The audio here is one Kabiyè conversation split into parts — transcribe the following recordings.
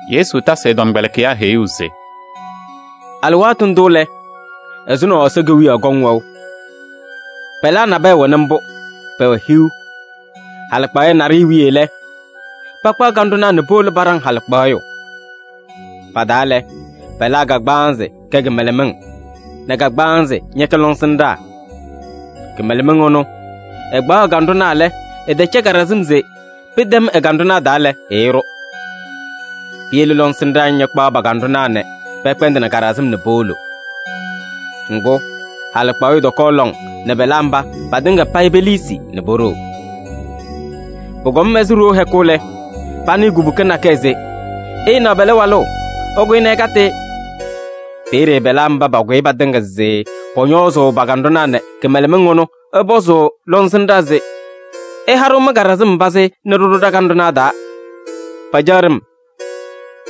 Yesu tasɩ ɛ-tɔmkpɛlɩkɩyaa heyuu se: “Alɩwaatʋ ndʋ lɛ, ɛzʋnɔ Ɛsɔ Kewiyaɣ kɔŋ wɛʋ: pɛlaa nabɛyɛ wɛnɩ mbʋ, pɛwɛ hiu. Halɩkpaɣyɛ naɖɩyɛ wiye lɛ, pakpaɣ kanɖʋnaa nɛ powolo paɖaŋ halɩkpaɣyʋ. Pa-taa lɛ, pɛlaa kagbaanzɩ kɛ kɩmɛlɛmɩŋ nɛ kagbaanzɩ ñɛkɛ lɔŋsɩnɖaa. Kɩmɛlɛmɩŋ ɩnʋ, ɩkpaɣ ɩ-kanɖʋnaa lɛ, ɩtɛcɛ kaɖɩsɩm se pɩtɛm ɩ-kanɖʋnaa taa lɛ, ɩɩɖʋ. Piyele lɔŋsɩnɖaa ñakpaɣ pa-kanɖʋnaa nɛ pɛkpɛndɩnɩ kaɖɩsɩm nɛ powolo. Ŋgʋ, halɩkpaɣyʋ tɔkɔɔ lɔŋ nɛ pɛlaa mba patɩŋa payɩ peliisi nɛ poɖoo. “Pʋkɔm ɛzɩ ɖoo hɛkʋ lɛ, panɩɩ kubuka nakɛyɛ se: ‘Ɩɩnaɣ pɛlɛ walʋ! Ɩkʋyɩ nɛ ɩkatɩ-ɩ!’ Peeye pɛlaa mba pakʋyɩ patɩŋa se pɔñɔɔzʋʋ pa-kanɖʋnaa nɛ kɩmɛlɛmɩŋ ɩnʋ, ɩpɔzʋʋ lɔŋsɩnɖaa se: ‘Ɩha-ɖʋ mɩ-kaɖɩsɩm pazɩ nɛ ɖɩɖʋ ɖa-kanɖʋnaa taa: pacaɣ ɖem.’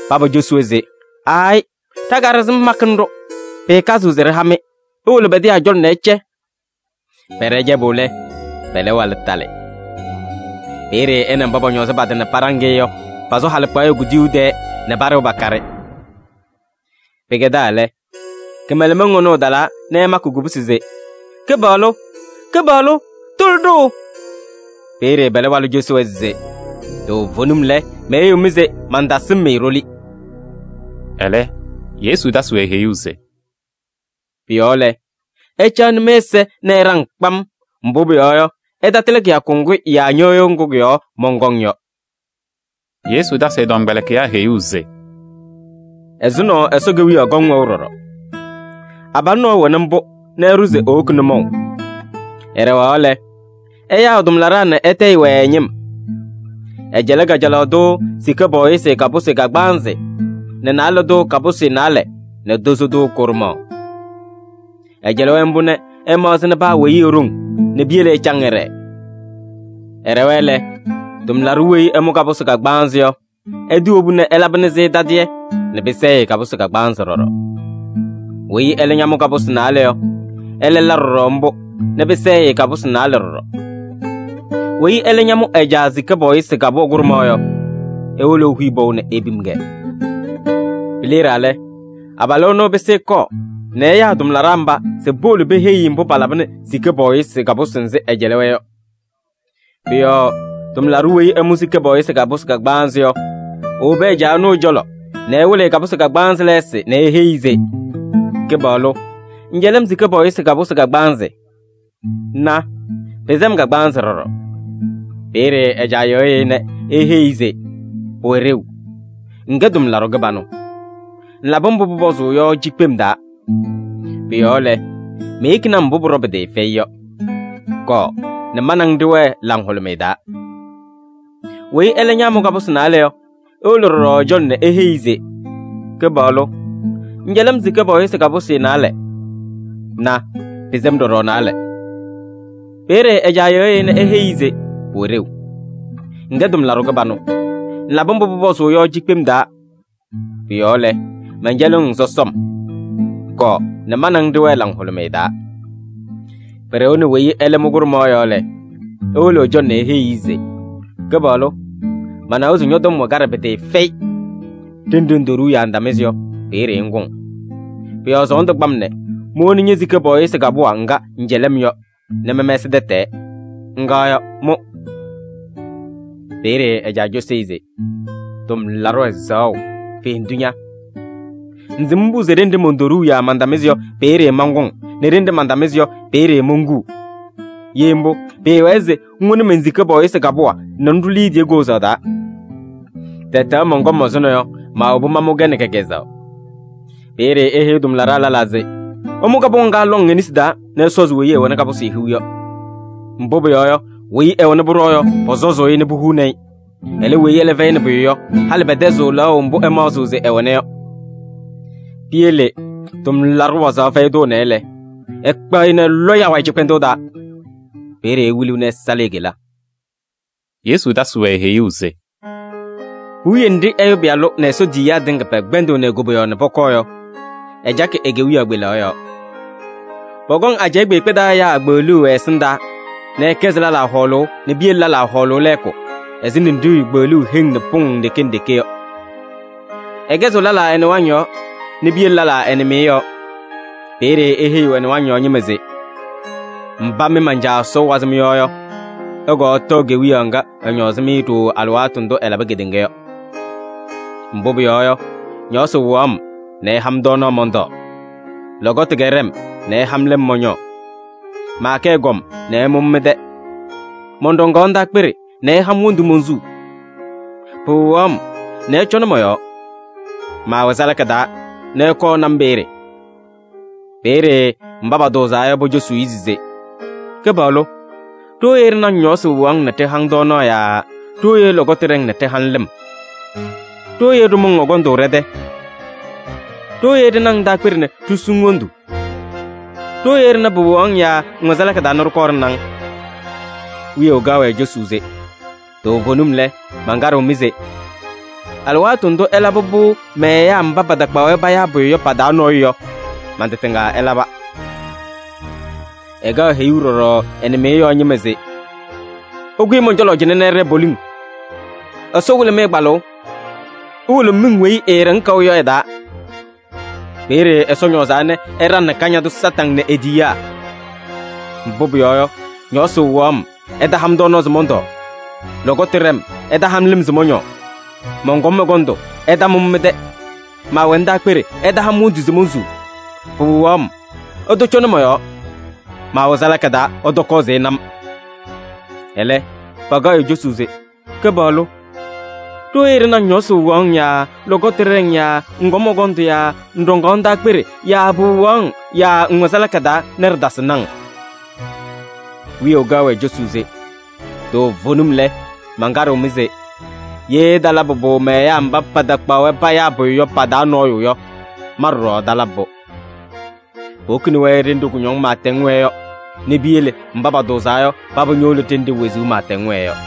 Paba ñocosi-wɛ se: ‘Aayɩ! Ɖa-kaɖɩsɩm makɩnɩ-ɖʋ, pɩɩkazɩɣ se ɖɩha-mɩ. Iwolo pɛdɩyaa cɔlɔ nɛ ɩcɛ.’ Pɛɖɛ cɛbʋ lɛ, pɛlɛ walʋ talɩ. Peeye ɛ nɛ mba pɔñɔɔzɩ pa-tɩ nɛ paɖaŋ-ɩ yɔ, pasʋ halɩkpaɣyɛ kuduyuu tɛɛ nɛ paɖɩɣ pakaɖɩ. Pɩkɛdaa lɛ, kɩmɛlɛmɩŋ ɩnʋ ɩtalaa nɛ ɩmakɩ kubusi se: ‘Kɩpaɣlʋ! Kɩpaɣlʋ! Tʋlɩ-ɖʋ!’ Peeye pɛlɛ walʋ cosi-wɛ se: ‘Toovenim lɛ, meheyiɣ-mɩ se mantasɩm-mɩ ɖoli.’” Ɛlɛ Yesu tasɩ-wɛ heyuu se: “Pʋ-yɔɔ lɛ, ɩcaɣnɩ mɩ-ɛza nɛ ɩɖaŋ kpam, mbʋ pʋyɔɔ yɔ, ɩtatɩlɩ kɩyakʋ ŋgʋ yaa ñɩɣyʋʋ ŋgʋ kʋ-yɔɔ mɔnkɔŋ yɔ.” Yesu tasɩ ɛ-tɔmkpɛlɩkɩyaa heyuu se: “Ɛzʋnɔ Ɛsɔ Kewiyaɣ kɔŋ wɛʋ ɖɔɖɔ: abalʋ nɔɔyʋ wɛnɩ mbʋ nɛ ɛɖʋ se ewoki nʋmɔʋ. Ɛɖɛɣaɣ lɛ, ɛyaa ɛ-tʋmlaɖaa nɛ ɛtayɩ-wɛ ɛ-ñɩm. Ɛcɛlɩ kajalaɣ tʋ sika pɔɔyɩsɩ kapʋsɩ kagbaanzɩ nɛ naalɛ tʋ kapʋsɩ naalɛ nɛ tozo tʋ kʋɖʋmaɣ. Ɛcɛlɩ-wɛ mbʋ nɛ ɛmaɣzɩnɩ paa weyi e-ɖoŋ nɛ piyele ɛcaŋ ɛɖɛɛ. Ɛɖɛwa lɛ, tʋmlaɖʋ weyi ɛmʋ kapʋsɩ kagbaanzɩ yɔ, ɛtɩwobu nɛ ɛlabɩnɩ-sɩ tadɩyɛ nɛ pɩsɛɛ-ɩ kapʋsɩ kagbaanzɩ ɖɔɖɔ. Weyi ɛlɛ ñamʋ kapʋsɩ naalɛ yɔ, ɛlɛ la ɖɔɖɔ mbʋ nɛ pɩsɛɛ-ɩ kapʋsɩ naalɛ ɖɔɖɔ. Weyi ɛlɛ ñamʋ ɛ-caa sika pɔɔyɩsɩ kapʋwa kʋɖʋmaɣ yɔ, ewolo ehuyi pɔʋ nɛ epim-kɛ. “Pileɖaa lɛ, abalʋ ɛnʋ ɛpɩsɩ ɛkɔɔ nɛ ɛyaa ɛ-tʋmlaɖaa mba se powolo peheyi-i mbʋ palabɩnɩ sika pɔɔyɩsɩ kapʋsɩ nzɩ ɛɛcɛlɩ-wɛ yɔ. Pʋ-yɔɔ tʋmlaɖʋ weyi ɛmʋ sika pɔɔyɩsɩ kapʋsɩ kagbaanzɩ yɔ, ewobi ɛ-caa ɛnʋ ɛ-cɔlɔ nɛ ɛwɩlɩ-ɩ kapʋsɩ kagbaanzɩ lɛɛsɩ nɛ eheyi-i se: ‘Kɩpaɣlʋ! Ŋŋcɛlɩ-m sika pɔɔyɩsɩ kapʋsɩ kagbaanzɩ. Na! Pɩsɛ-m kagbaanzɩ ɖɔɖɔ.’ Peeye ɛ-caa yɩɣyɩ-ɩ nɛ eheyi-i se: ‘Pʋwɛ ɖeu. Ŋkɛ tʋmlaɖʋ kɩbanʋ. Ŋlabɩ mbʋ pʋpɔzʋʋ yɔ cikpem taa. Pʋ-yɔɔ lɛ, meyekini-ŋ mbʋ pʋɖɔwa pɩtɩɩfɛyɩ yɔ. Kɔɔ nɛ ma nɛ ŋ ɖɩwɛɛ laŋhʋlʋmɩyɛ taa.’ Weyi ɛlɛ ñaamʋ kapʋsɩ naalɛ yɔ, ewolo ɖɔɖɔ ɛ-cɔlɔ nɛ eheyi-i se: ‘Kɩpaɣlʋ! Ŋŋcɛlɩ-m sika pɔɔyɩsɩ kapʋsɩ naalɛ. Na! Pɩsɛ-m ɖɔɖɔ naalɛ.’ Peeye ɛ-caa yɩɣyɩ-ɩ nɛ eheyi-i se: ‘Pʋwɛ ɖeu. Ŋkɛ tʋmlaɖʋ kɩbanʋ. Ŋlabɩ mbʋ pʋpɔzʋʋ yɔ cikpem-taa. Pʋ-yɔɔ lɛ, mɛncɛlɩɣ-ŋ sɔsɔm. Kɔɔ nɛ ma nɛ ŋ ɖɩwɛɛ laŋhʋlʋmɩyɛ taa.’ Pɩɖɩɣnɩ weyi ɛlɛ mʋ kʋɖʋmaɣ yɔ lɛ, ewolo ɛ-cɔlɔ nɛ eheyi-i se: ‘Kɩpaɣlʋ! Manawa se ñɔ-tɔm wɛ kaɖɛ pɩtɩɩfɛyɩ. Ɖenɖe ŋtoɖuu yaa ŋtamɩzɩ yɔ, peeye ŋkʋŋ. Pʋ-yɔɔ sɔɔndʋ kpa-m nɛ mowoni ñe-sika pɔɔyɩsɩ kapʋwa ŋga ŋcɛlɩ-m yɔ nɛ mɛmɛsɩ tɛtɛɛ. Ŋga yɔ, mʋ!’ Peeye ɛ-caa cosi-i se: ‘Tʋmlaɖʋ ɛzaɣʋ, fendu ña! Ŋsɩm mbʋ se ɖenɖe montoɖuu yaa mantamɩzɩ yɔ, peeye mankʋŋ nɛ ɖenɖe mantamɩzɩ yɔ, peeye monkuu. Ye mbʋ, pɩɩwɛɛ se ŋwoni men-sika pɔɔyɩsɩ kapʋwa nɛ ŋɖʋ liidiye koozaɣ taa. Tɛtɛɣ mɔnkɔm ɛzʋnɔ yɔ, maawobi mamʋ-kɛ nɛ kɛ-kɛzɛɣ.’ Peeye eheyi tʋmlaɖaa lɛlaa se: ‘Ɩmʋ kapʋwa ŋga lɔŋ e-nesi taa nɛ ɩsɔzɩ weyi ɛwɛnɩ kapʋsɩ hiu yɔ. Mbʋ pʋyɔɔ yɔ, weyi ɛwɛna pʋɖɔɔ yɔ, pɔsɔzʋʋ-ɩ nɛ puhuuni-i. Ɛlɛ, weyi ɛlɛ fɛyɩnɩ pʋyʋ yɔ, halɩ pɛtɛzɩɣ lɛɣʋ mbʋ ɛmaɣzɩɣ se ɛwɛna yɔ. Piyele tʋmlaɖʋ wazaɣ fɛyɩ tʋ ɛnɛ lɛ, ɩkpaɣ-ɩ nɛ ɩlɔ-ɩ awayɩ cɩkpɛndʋʋ taa. Peeye ewiliɣ nɛ ɛsalɩ e-kela.’” Yesu tasɩ-wɛ heyuu se: “Puwiye nɖɩ Ɛyʋ Pɩyalʋ nɛ Ɛsɔ tiyiyaa tɩŋa pɛkpɛndɩɣnɩ e-koboyaɣ nɛ pɔkɔɔ yɔ, ɛcakɩ e-kewiyaɣ kpelaɣ yɔɔ. Pɔkɔŋ ajɛɛ kpeekpe taa ɛyaa kpeɣluu ɛ-ɛsɩndaa nɛ ɛkɛzɩ lɛlaa hɔɔlʋʋ nɛ piyele lɛlaa hɔɔlʋʋ lɛɛkʋ ɛzɩ ninɖiɣyu kpeɣluuu heŋ nɛ pʋŋ nɖeke nɖeke yɔ. Ɛkɛzɩɣ lɛlaa ɛ-nɩwaŋ yɔɔ nɛ piyele lɛlaa ɛ-nɩmɩyɛ yɔɔ. Peeye eheyiɣ ɛ-nɩwaŋ yɔɔ ñɩma se: ‘Mba mɩ man-Caa Ɛsɔ wazɩ mɩ-yɔɔ yɔ, ɩkɔɔ ɩtɔɔ Kewiyaɣ ŋga ɛñɔɔzɩ-mɩ ɖooo alɩwaatʋ ndʋ ɛlabɩ kedeŋa yɔ. Mbʋ pʋyɔɔ yɔ, ñɔɔsɩ wɩɣaɣ-m nɛ ɩha-m tɔɔnaɣ mɔntɔɔ. Lɔkɔtʋ kɛɖɛ-m ɩha-m lɩm mɔñɔɔ. Maakɛ ɛgɔm nɛ ɩmʋ-m mɩ-tɛ. Mɔnɖɔŋaɣ ndaakpeɖe nɛ ɩha-m wondu monsuu. Pɩwɩɣaɣ-m nɛ ɩcɔnɩ mɔ-yɔɔ. Maawɛ salaka taa nɛ ɩkɔɔ ɩna-m peeye.’ Peeye mba patʋʋzaa yɔ, pocosuu-i se: ‘Kɩpaɣlʋ! Ɖooye ɖɩna-ŋ ñɔɔsɩ wɩɣaɣ-ŋ nɛ ɖɩha-ŋ tɔɔnaɣ yaa ɖooye lɔkɔtʋ ɖɛ-ŋ nɛ ɖɩha-ŋ lɩm? Ɖooye ɖɩmʋ-ŋ ɛgɔndʋ ɖɛ-tɛ? Ɖooye ɖɩna-ŋ ndaakpeɖe nɛ ɖisu-ŋ wondu? Ɖooye ɖɩna pɩwɩɣaɣ-ŋ yaa ŋwɛ salaka taa nɛ ɖɩkɔɔ ɖɩna-ŋ?’ Wiyaʋ kaɣ-wɛ cosuu se: ‘Toovenim lɛ, mankaɖɩɣ-mɩ se: alɩwaatʋ ndʋ ɩlabɩ-pʋ mɛ-ɛyaa mba patakpaɣ-wɛ payaa pʋyʋ yɔ pa-taa nɔɔyʋ yɔ, man-tɩ tɩŋa ɩlaba.’ “Ɛkaɣ heyuu ɖɔɖɔ ɛ-nɩmɩyɛ yɔɔ ñɩma se: ‘Ɩkʋyɩ mɔn-cɔlɔ cɩnɛ nɛ ɩɖɛɛ poliŋ, Ɛsɔ wɩlɩ-mɩ kpalʋʋ! Iwolo miŋ weyi eeɖeŋ kaʋ yɔ ɛ-taa. Peeye Ɛsɔ ñɔɔzaa nɛ ɛɖaŋnɩ Kañadʋ Satanɩ nɛ e-tiyiyaa! Mbʋ pʋyɔɔ yɔ, ñɔɔsɩ wɩɣaɣ-m, ɩtaha-m tɔɔnaɣ se mɔntɔɔ. Lɔkɔtʋ ɖɛ-m, ɩtaha-m lɩm se mɔñɔɔ. Mɔnkɔm ɛgɔndʋ, ɩtamʋ-m mɩ-tɛ. Maawɛ ndaakpeɖe, ɩtaha-m wondu se monsuu, pɩwɩɣaɣ-m, ɩtɔcɔnɩ mɔ-yɔɔ. Maawɛ salaka taa, ɩtɔkɔɔ se ɩna-m.’ Ɛlɛ, pakaɣ-ɩ cosuu se: ‘Kɩpaɣlʋ! Ɖooye ɖɩna-ŋ ñɔɔsɩ wɩɣaɣ-ŋ yaa lɔkɔtʋ ɖɛ-ŋ yaa ŋkɔm ɛgɔndʋ yaa ŋɖɔŋaɣ ndaakpeɖe yaa pɩwɩɣaɣ-ŋ yaa ŋwɛ salaka taa nɛ ɖɩtasɩnɩ-ŋ?’ Wiyaʋ kaɣ-wɛ cosuu se: ‘Toovenim lɛ, mankaɖɩɣ-mɩ se: ye ɩtalabɩ-pʋ mɛ-ɛyaa mba patakpaɣ-wɛ payaa pʋyʋ yɔ, pa-taa nɔɔyʋ yɔ, ma ɖɔɖɔ ɩtalabɩ-pʋ.’ Powokini-wɛ ɖenɖe kʋñɔŋ pɩɩtɛŋ wɛɛ yɔ nɛ piyele mba patʋʋzaa yɔ, paba ñowolo ɖenɖe wezuu pɩɩtɛŋ wɛɛ yɔ.”